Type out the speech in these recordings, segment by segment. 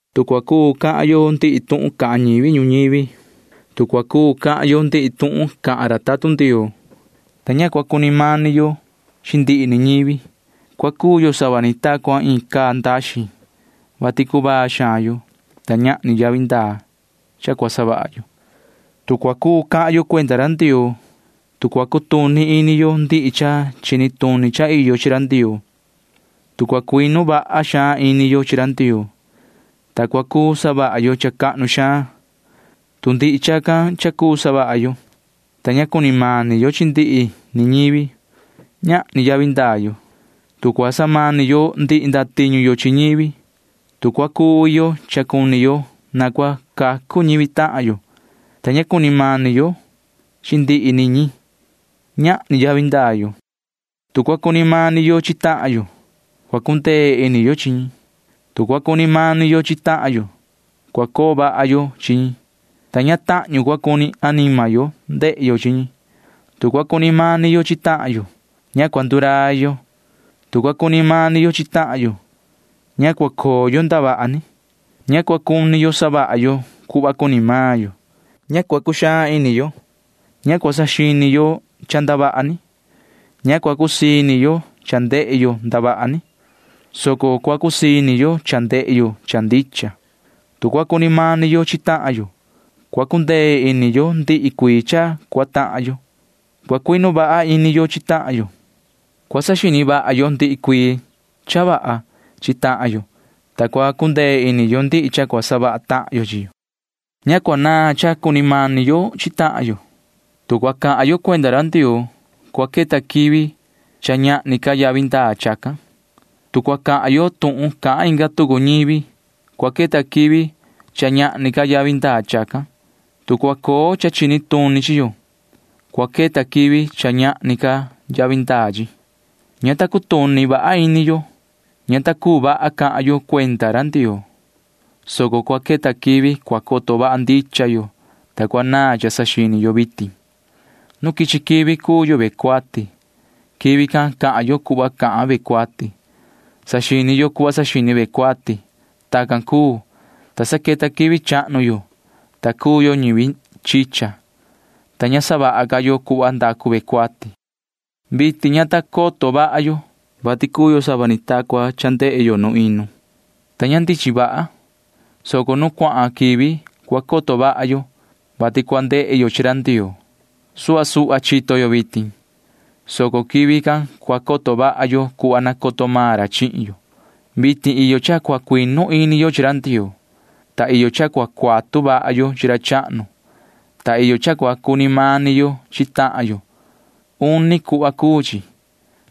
Tu cua cuu cahan yo ndihi tuhun cahan ñivi ñuñivi, tu cua cuu cahan yo ndihi tuhun cahan ra tatun Ndioo, ta ña cua cuni mani yo chi ndihi ni ñivi, cua cuu yo sava ni ta cua iin caa ndaxin, vati cuvaa xaan yo, ta ñahni yavi ndaa cha cua savaha yo. Tu cua cuu cahan yo cuenda ra Ndioo, tu cua cutuni ini yo ndihi cha chini tuni cha iyo chi ra Ndioo, tu cua cuinu vaha xaan ini yo chi ra Ndioo, ta cua cuu savaha yo cha cahnu xaan, tu ndihi chacan cha cuu savaha yo, ta ña cuni mani yo chi ndihi ni ñivi, ñahni yavi ndaa yo. Tu cua samani yo ndihi ndatiñu yo chi ñivi, tu cua cuvi yo cha cuni yo na cua cacu ñivi tahan yo, ta ña cuni mani yo chi ndihi ni ñi, ñahni yavi ndaa yo. Tu cua cuni mani yo chi tahan yo, cua cundee ini yo chi ñi. Tu cua cuni mani yo chi tahan yo, cua coo vaha yo chi ñi, ta ña tahñu cua cuni anima yo ndehe yo chi ñi. Tu cua cuni mani yo chi tahan yo, ña cua ndurai yo. Tu cua cuni mani yo chi tahan yo, ña cua coo yo ndavaha ni. Ña cua cuni yo savaha yo cuhva cuni maan yo. Ña cua cuxaan ini yo. Ña cua saxini yo cha ndavaha ni. Ña cua cusii ini yo cha ndehe yo ndavaha ni, soco cua cusii ini yo cha ndehe yo cha ndicha. Tu cua cuni mani yo chi tahan yo, cua cundee ini yo ndihi cuii cha cua tahan yo. Cua cuinu vaha ini yo chi tahan yo. Cua saxini vaha yo ndihi cuii cha vaha chi tahan yo, ta cua cundee ini yo ndihi cha cua savaha tahan yo chi yo. Ña cua naan cha cua cuni mani yo chi tahan yo. Tu cua cahan yo cuenda ra Ndioo, cua queta quivi cha ñahni ca yavi ndaa chacan. Tu cua cahan yo tuhun cahan inga tucu ñivi, cua queta quivi cha ñahni ca yavi ndaa chacan. Tu cua coo cha chini tuni chi yo, cua queta quivi cha ñahni ca yavi ndaa chi. Ña ta cutuni vaha ini yo. Ña ta cuu vaha cahan yo cuenda ra Ndioo, soco cua queta quivi cua coto vaha ndicha yo, ta cua naan cha saxini yo vitin. Nu quichi quivi cuu yo ve cuati. Quivi can cahan yo cuhva cahan ve cuati. Saxini yo cuhva saxini ve cuati. Tacan cuu, ta sa queta quivi chahnu yo, ta cuu yo ñivi chicha, ta ña savaha ca yo cuhva ndacu ve cuati. Vitin ña ta coto vaha yo, vati cuu yo sava ni ta cua cha ndehe yo nu inu, ta ña ndichin vaha, soco nu cuahan quivi cua coto vaha yo, vati cua ndehe yo chi ra Ndioo. Suhva suhva chito yo vitin, soco quivi can cua coto vaha yo cuhva nacoto maan ra chihin yo. Vitin iyo cha cua cuinu ini yo chi ra Ndioo, ta iyo cha cua cuatu vaha yo chi ra chahnu, ta iyo cha cua cuni mani yo chi tahan yo. Uni cuhva cuu chi,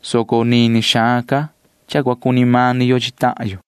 soco nini xaan ca cha cua cuni mani yo chi tahan yo.